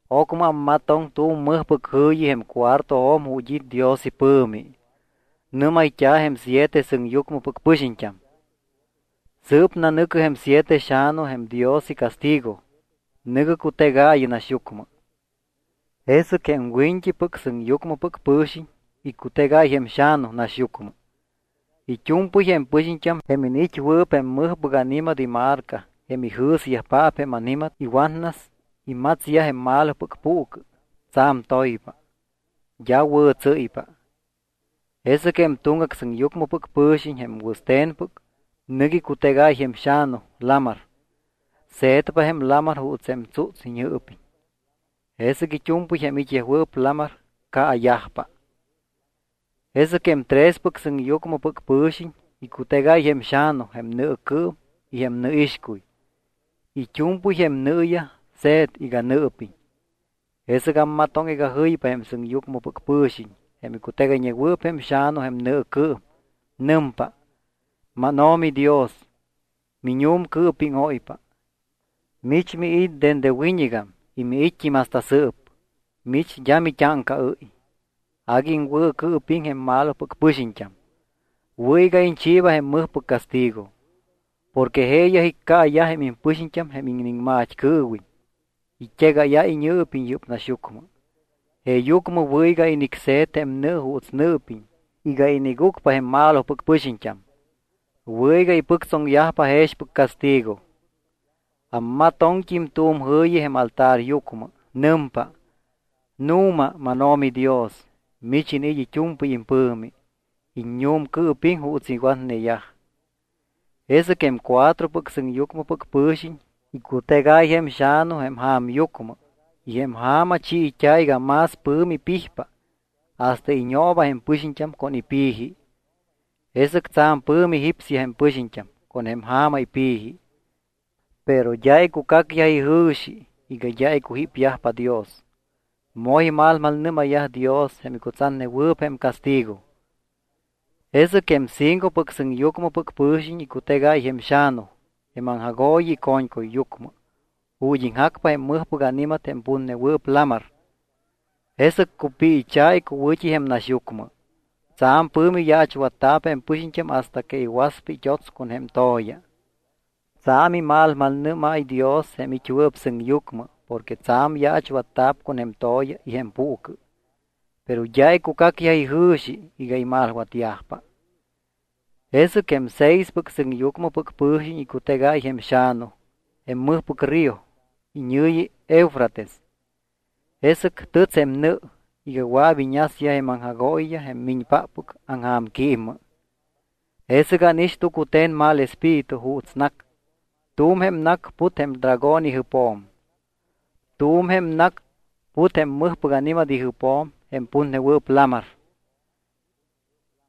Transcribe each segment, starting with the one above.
Ocmɨ ammatoŋ tu̱m mɨjpɨc jɨ̱yi jém cuartojo̱m ju̱t́ it́ Dios ipɨ̱mi. Nɨ́mayt́a̱ jém siete sɨŋyucmɨpɨc pɨxiñt́am: —Sɨɨp nanɨ̱cɨ jém siete xa̱nu jém Dios icastigo. Nɨ̱gɨ cutegaayɨ naxyucmɨ. Jesɨc jém wiñt́ipɨc sɨŋyucmɨpɨc pɨ̱xiñ icutegáy jém xa̱nu naxyucmɨ. It́u̱mpɨy jém pɨxiñt́am jém iniit́wɨɨp jém mɨjpɨc ani̱mat imarca jém ijɨ̱syajpaap jém ani̱mat iwatnas imatsyaj jém malopɨc puucɨ tsa̱m toypa, d́a wɨ̱tsɨ́ypa. Jesɨc jém tuŋgac sɨŋyucmɨpɨc pɨ̱xiñ jém wɨste̱npɨc nɨc icutegáy jém xa̱nu lamar. Se̱tpa jém lamar juuts jém tsúts iñɨɨpiñ. Jesɨc it́u̱mpɨy jém it́yajwɨɨp lamar caayajpa. Jesɨc jém trespɨc sɨŋyucmɨpɨc pɨ̱xiñ icutegáy jém xa̱nu jém nɨɨcɨɨm y jém nɨixcuy. It́u̱mpɨy jém nɨɨyaj se̱t iga nɨɨpiñ. Jesɨc ammatoŋ iga jɨypa jém sɨŋyucmɨpɨc pɨ̱xiñ jém icutegayñewɨɨp jém xa̱nu jém nɨɨcɨɨm. Nɨmpa: —MánO̱mi Dios, miñu̱mcɨɨpíŋóypa. Mich miit́ dende wiñɨgam y miit́t́im hasta sɨɨp. Mich d́a mit́áŋcaɨ́y. Agui iŋwɨ̱cɨɨpiŋ jém malopɨc pɨxiñt́am. Wɨ̱ iga iñchiiba jém mɨjpɨc castigo. Porque jeeyaj iccaayaj jém impɨxiñt́am jém iniŋmat́cɨɨwiñ. It́egáyáy iñɨɨpiñ yɨ́p naxyucmɨ. Jeeyucmɨ wɨ̱ iga inicse̱t jém nɨ juuts nɨɨpiñ iga inigucpa jém malopɨc pɨxiñt́am. Wɨ̱ iga ipɨctsoŋyajpa jexpɨc castigo. Ammatoŋt́im tu̱m jɨ̱yi jém altaryucmɨ. Nɨmpa: —Nu̱ma, mánO̱mi Dios, mich iniit́ it́u̱mpɨy impɨ̱mi, iññu̱mcɨɨpiŋ juuts iwatneyaj. Jesɨc jém cuatropɨc sɨŋyucmɨpɨc pɨ̱xiñ icutegáy jém xa̱nu jém ja̱myucmɨ y jém ja̱ma chiit́a̱ iga más pɨ̱mi pijpa hasta iñooba jém pɨxiñt́am con jém ipi̱ji. Jesɨc tsa̱m pɨ̱mi jípsyaj jém pɨxiñt́am con jém ja̱ma ipi̱ji. Pero d́a icucacyaj ijɨ̱xi iga d́a icujípyajpa Dios. Moj imalmalnɨ́mayyaj Dios jém icutsatnewɨɨp jém castigo. Jesɨc jém cincopɨc sɨŋyucmɨpɨc pɨ̱xiñ icutegáy jém xa̱nu jém aŋjagooyi ico̱ñcuyyucmɨ ju̱t́ iŋjacpa jém mɨjpɨc ani̱mat jém putnewɨɨp lamar. Jesɨc cupiicha̱ icuwɨ̱t́i jém naxyucmɨ. Tsa̱m pɨ̱mi yaachwatta̱p jém pɨxiñt́am hasta que iwaspa it́ots con jém to̱ya. Tsa̱m imalmalnɨ́máy Dios jém it́wɨɨp sɨŋyucmɨ porque tsa̱m yaachwatta̱p con jém to̱ya y jém puucɨ. Pero d́a icucacyaj ijɨ̱xi iga imalwatyajpa. Jesɨc jém seispɨc sɨŋyucmɨpɨc pɨ̱xiñ icutegáy jém xa̱nu jém mɨjpɨc río iñɨ̱yi Eufrates. Jesɨc tɨts jém nɨ iga wɨa̱p iñasyaj jém aŋjagooyiyaj jém miñpáppɨc aŋja̱mquímmɨ. Jesɨc ánix tucute̱n mal espíritu juuts nac. Tu̱m jém nac put jém dragón ijɨpjo̱m. Tu̱m jém nac put jém mɨjpɨc ani̱mat ijɨpjo̱m jém putnewɨɨp lamar.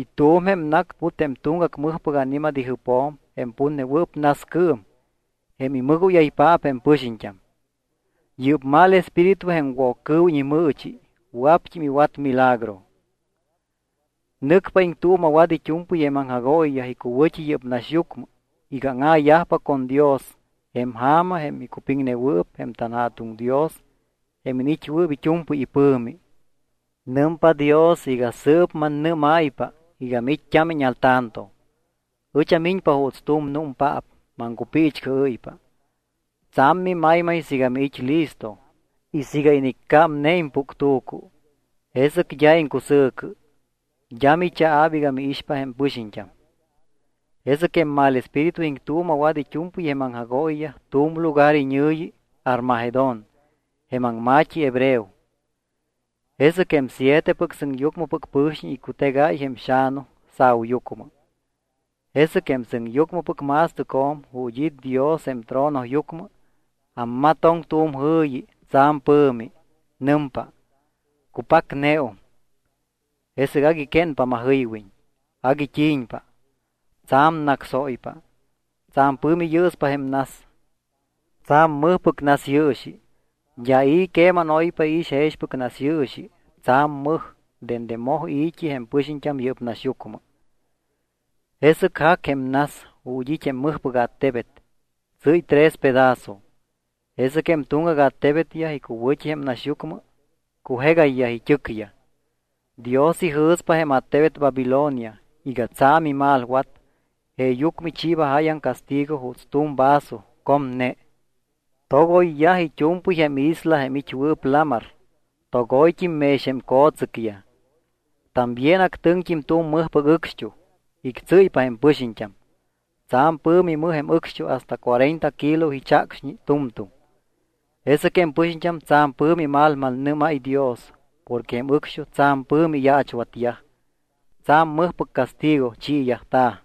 Y tu̱m jém nac put jém tuŋgac mɨjpɨc ani̱mat ijɨpjo̱m jém putnewɨɨp nascɨɨm jém imɨgóyaypaap jém pɨxiñt́am. Yɨ́p mal espíritu jém Woccɨɨwiñ imɨɨchi wɨa̱pt́im iwat milagro. Nɨcpa iŋtuuma̱wat it́u̱mpɨy jém aŋjagooyiyaj icuwɨ̱t́i yɨ́p naxyucmɨ iga áŋa̱yajpa con Dios jém ja̱ma jém icupiŋnewɨɨp jém tanJa̱tuŋ Dios jém iniit́wɨɨp it́u̱mpɨy ipɨ̱mi. Nɨmpa Dios iga sɨɨp mannɨ́máypa iga miit́t́ámiñ al tanto. Ɨch amiñpa juuts tu̱m númpaap maŋcupiichcɨɨ́ypa. Tsa̱m mimaymay siiga miit́ listo y siiga iniccámne impuctu̱cu. Jesɨc d́a iŋcusɨ̱cɨ. D́a michaa̱p iga miixpa jém pɨxiñt́am. Jesɨc jém mal espíritu iŋtuuma̱wat it́u̱mpɨy jém aŋjagooyiyaj tu̱m lugar iñɨ̱yi Armagedón jém aŋma̱t́i hebreo. Jesɨc jém sietepɨc sɨŋyucmɨpɨc pɨ̱xiñ icutegáy jém xa̱nu sa̱uyucmɨ. Jesɨc jém sɨŋyucmɨpɨc ma̱stɨcjo̱m, ju̱t́ it́ Dios jém tronoyucmɨ, ammatoŋ tu̱m jɨ̱yi tsa̱m pɨ̱mi. Nɨmpa: —Cupacneum. Jesɨc agui quénpa majɨywiñ. Agui t́i̱ñpa. Tsa̱m nácsóypa. Tsa̱m pɨ̱mi yɨɨspa jém nas. Tsa̱m mɨjpɨc nasyɨɨxi. D́a i̱ queman oypa iix jexpɨc nasyɨɨxi tsa̱m mɨj dende moj i̱t́i jém pɨxiñt́am yɨ́p naxyucmɨ. Jesɨc jac jém nas ju̱t́ it́ jém mɨjpɨc attebet. Tsɨ́y tres pedazo. Jesɨc jém tuŋgac attebetyaj icuwɨ̱t́i jém naxyucmɨ cujegayyaj it́ɨcyaj. Dios ijɨ̱spa jém attebet Babilonia iga tsa̱m imalwat jeeyucmɨ ichiiba jáyaŋ castigo juuts tu̱m vaso comne. Togoyyaj it́u̱mpɨy jém isla jém it́wɨɨp lamar. Togoyt́im mex jém co̱tsɨcyaj. También actɨŋt́im tu̱m mɨjpɨc ɨcxt́uj. Ictsɨ́ypa jém pɨxiñt́am. Tsa̱m pɨ̱mi mɨj jém ɨcxt́uj hasta cuarenta kilo ichacxñi tu̱mtu̱m. Jesɨc jém pɨxiñt́am tsa̱m pɨ̱mi imalmalnɨ́máy Dios porque jém ɨcxt́uj tsa̱m pɨ̱mi iyaachwatyaj. Tsa̱m mɨjpɨc castigo chiiyajta̱.